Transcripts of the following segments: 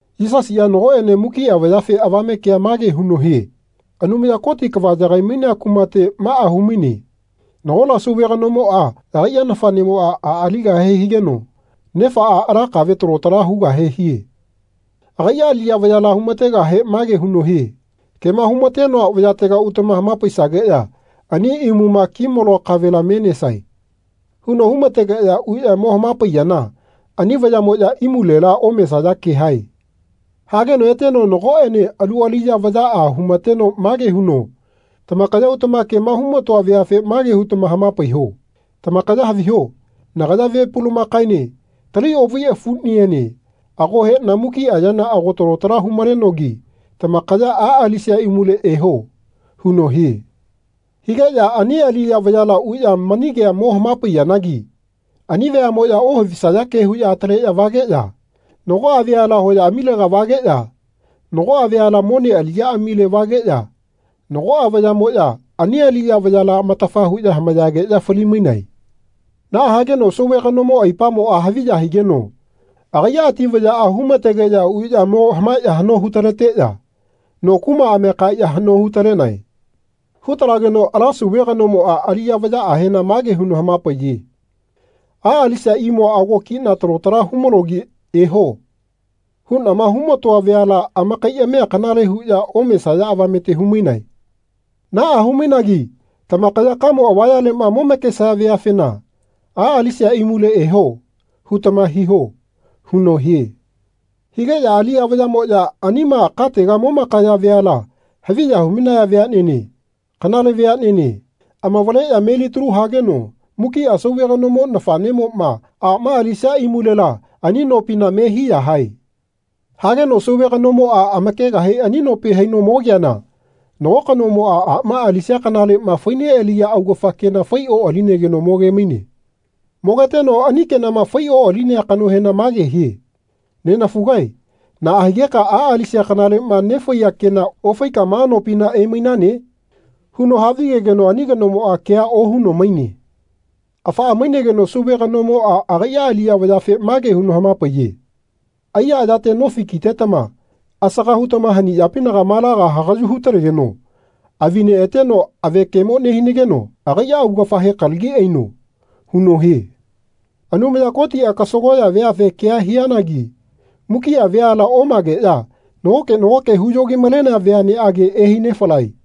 Yisasiꞌa nagoꞌene mukiꞌa vayafe avame kea mage huno hie Anumaya Koti kava yagai-mainea kumate maꞌa hu-maine nagola sauve kanomoꞌa agaiꞌa nafaꞌnemoꞌa a aligahe higeno nefaꞌa ala kave talo tala hugahe hie. Agaiꞌa aliꞌya vayala hu-ma-tegahe mage huno hie “Kema hu-ma-tenoa vayatega utama hama-paisageꞌya ani imuma ki-maloa kavela me nesae.” huno hu-ma-tegeꞌya uꞌya mo hama-paiyana ani vayaꞌmoꞌya imulena omesaya ke hae. Hageno eteno nagoꞌene alu aliꞌya vayaꞌa hu-ma-teno mage huno “Tamakaya utama kema hu-ma-toa veafe mage hutama hama-paiho Tamakaya haviho nagaya ve pulamakaene tali oꞌvai afuꞌniene ago heꞌna mukiꞌa yana ago talo tala hu-malenogi tamakaya a alisia imule eho.” huno hie. Higeꞌya ani aliꞌya vayala uꞌya mani kea mo hama-paiyanagi ani veaꞌmoꞌya ohavisaya ke huꞌya ataleꞌya vageꞌya nagoꞌa veala hoyaꞌamilega vageꞌya nagoꞌa veala mone aliꞌyaꞌamile vageꞌya nagoꞌa vayaꞌmoꞌya ani aliꞌya vayala amatafa huꞌya hamayageꞌya fali-mainae. Naꞌa hageno sauve kanomo aipamoꞌa haviya higeno agaiꞌa ati vayaꞌa hu-ma-tegeꞌya uꞌya mo hamaeꞌya haꞌno hu-taleteꞌya no kumaꞌamia kaeꞌya haꞌno hu-talenae. Hu-talageno ala sauve kanomoꞌa aliꞌya vayaꞌahena mage huno hama-paiye “A alisia imua ago kiꞌna talo tala hu-malogi ‘Eho.’ huꞌnama hu-ma-toa veala amakaiꞌamia kanale huꞌya omesaya avamete hu-mainae. Naꞌa hu-mainagi tamakaya kamo avayaleꞌma momakesaya veafena ‘A alisia imule eho.’ hutama hiho.” huno hie. Higeꞌya aliꞌya vayaꞌmoꞌya anima katega momakaya veala haviya hu-mainaya veaꞌnene kanale veaꞌnene amavaleꞌya melitalu hageno mukiꞌa sauve kanomo nafaꞌnemoꞌma aꞌma alisia imulela ani nopina me hiya hae. Hageno sauve kanomoꞌa amakegahe ani nopi haino mogeana nago kanomoꞌa aꞌma alisia kanaleꞌma fai-neꞌaliya augafa kena fai-oꞌalinegeno moge-maine. Mogeteno ani kenama fai-oꞌalinea kanohena mage hie “Nenafugae naꞌa higeka a alisia kanaleꞌma nefaiya kena ofaika ma nopina emainane?” huno havigegeno ani kanomoꞌa kea ohuno maine. Afaꞌa maigeno sauve kanomoꞌa agaiꞌa aliꞌya vayafe mage huno hama-paiye “Aiya ayate nofi kitetama asaga hutama haniꞌyapinaga malaga hagaꞌyu hu-talegeno avi-neꞌateno avekemo nehinageno agaiꞌa augafahe kalagi aino.” huno hie. Anumaya Kotiꞌa kasagoꞌya veafe kea hianagi mukiꞌa veala omageꞌya nagoke nagoke huyo-gi-malenea veaꞌneꞌage ehai-nefalae.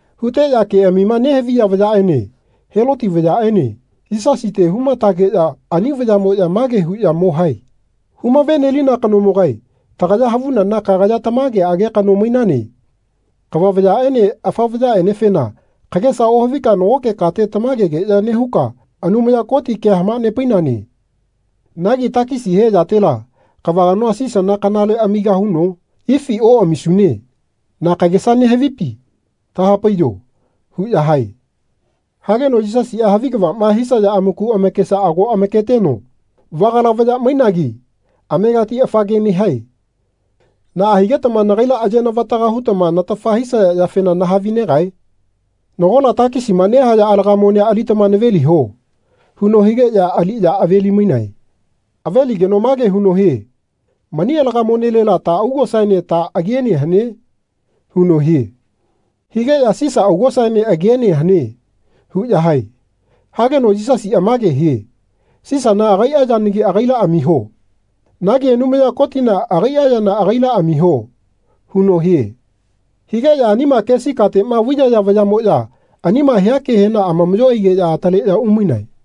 Huteꞌya keꞌamima nehaviya vayaꞌene Heloti vayaꞌene Yisasite hu-ma-tageꞌya ani vayaꞌmoꞌya mage huꞌya mo hae “Humave-nelina kanomogae tagaya havunana kagaya tamageꞌage kano mainane. Kava vayaꞌene afa vayaꞌenefena kagesa ohavika nagoke kate tamagegeꞌya nehuka Anumaya Koti kea hama-nepainane. Nagi takisi he yatela kava kanoa Sisana kanale amigahuno ifi oꞌamisune? Na kagesa nehavipi? Taha-paiyo.” huꞌya hae. Hageno Yisasiꞌa havi kavaꞌma hisaya amaku amakesa ago amaketeno “Vagala vaya mainagi amegati afa ke nehae. Naꞌa higetama nagaila aye-navataga hutama natafa hisaya yafena nahavi-negae? Nagola takisima nehaya alaga monea alitama naveliho.” huno higeꞌya aliꞌya ave-li-mainae. Aveligeno mage huno hie “Mani alaga monelela ta augosaene ta agiene hane?” huno hie. Higeꞌya “Sisa augosaene agiene hane.” huꞌya hae. Hageno Yisasiꞌa mage hie “Sisana agaiꞌa yanagi agaila amiho. Nagi Anumaya Kotina agaiꞌa yana agaila amiho.” huno hie. Higeꞌya anima kesi kateꞌma vaiyaya vayaꞌmoꞌya anima hia kehena amamaꞌyo aigeꞌya ataleꞌya umainae.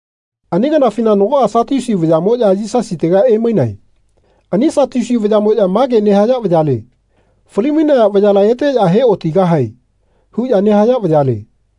Ani kanafina nagoꞌa Satiusi vayaꞌmoꞌya Yisasitega emainae. Ani Satiusi vayaꞌmoꞌya mage nehaya vayale “Fali-mainaya vayala eteꞌya he-otigahae.” huꞌya nehaya vayale.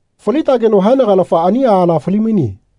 Faltageno haenagalafa ani aala fali-maine.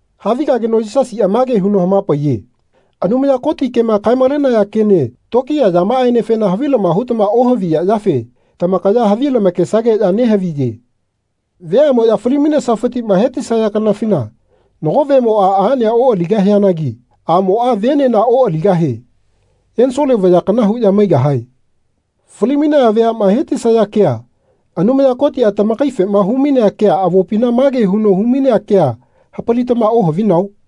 Havigageno Yisasiꞌa mage huno hama-paiye Anumaya Koti kema kae-malenaya kene tokiya yamaꞌaenefena havilama hutama ohaviya yafe tamakaya havi lamakesageꞌya nehaviye. Veaꞌmoꞌya fali-mainesafitiꞌma hetisaya kanafina nago vemoꞌa aꞌnea oꞌaligahianagi aꞌmoꞌa venena oꞌaligahie. Ensole vaya kana huꞌya maigahae. Fali-mainaya veaꞌma he-ti-saya kea Anumaya Kotiꞌa tamakaifema hu-mainea kea avopina mage huno hu-mainea kea hapalitama ohavinao?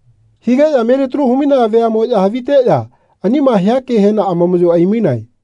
Higeꞌya melitalu hu-mainaya veaꞌmoꞌya haviteꞌya anima hia kehena amamaꞌyo ai-mainae.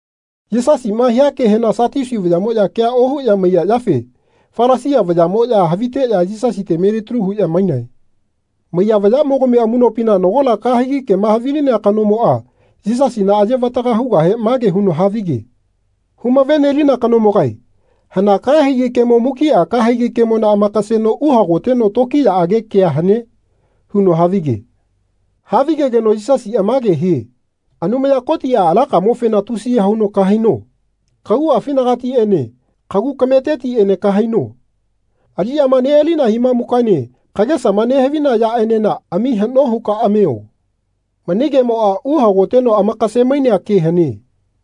Yisasiꞌma hia kehena Satiusi vayaꞌmoꞌya kea ohuꞌya maiya yafe Falasia vayaꞌmoꞌya haviteꞌya Yisasite melitalu huꞌya mainae. Maiya vayaꞌmogami amuꞌnopina nagola kahegi kema havilinea kanomoꞌa Yisasina aye-vataga hugahe mage huno havige. “Hu-lave-nelina kanomogae hana kahegi kemo mukiꞌa kahegi kemona amakaseno uhagoteno tokiyaꞌage kea hane?” huno havige. Havigegeno Yisasiꞌa mage hie “Anumaya Kotiꞌa alakamofena tusiya huno kahaino. Kaguꞌafinagatiꞌene kagu kametetiꞌene kahaino. Aliꞌyama neꞌalina himamukaene kagesama nehavina yaꞌenena ami haꞌno huka amio. Mani kemoꞌa uhagoteno amakase-mainea ke hane.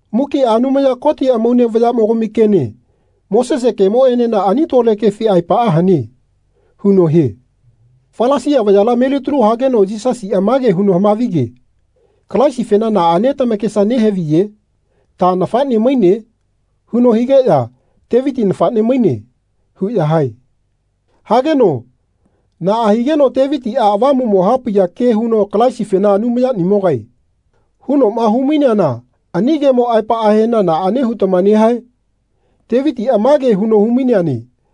Mukiꞌa Anumaya Koti amaune vayaꞌmogami kene Mosese kemoꞌenena ani tole kefi aepaꞌa hane.” huno hie. Falasia vayala melitalu hageno Yisasiꞌa mage huno hama-vige “Kalaisifena naꞌane tamakesa nehaviye? Ta nafaꞌne maine?” huno higeꞌya “Teviti nafaꞌne maine.” huꞌya hae. Hageno “Naꞌa higeno Tevitiꞌa Avamuꞌmo hapaiya ke huno Kalaisifena ‘Anumayanimogae.’ hunoꞌma hu-maineana ani kemo aepaꞌahena naꞌane hutama nehae? Tevitiꞌa mage huno hu-maineane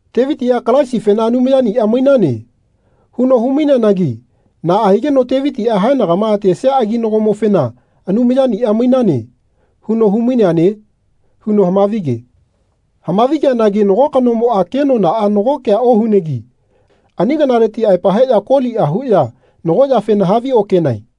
Tevitiꞌa Kalaisifena ‘Anumayaniꞌa mainane.’ huno hu-maineanagi naꞌa higeno Tevitiꞌa haenagama atesia aginagomofena ‘Anumayaniꞌa mainane.’ huno hu-maineane?” huno hama-vi-ge. Hama-vi-geanagi nago kanomoꞌa kenonaꞌa nago kea ohunegi ani kanaleti aepa heꞌya koliꞌa huꞌya nago yafena haviokenae.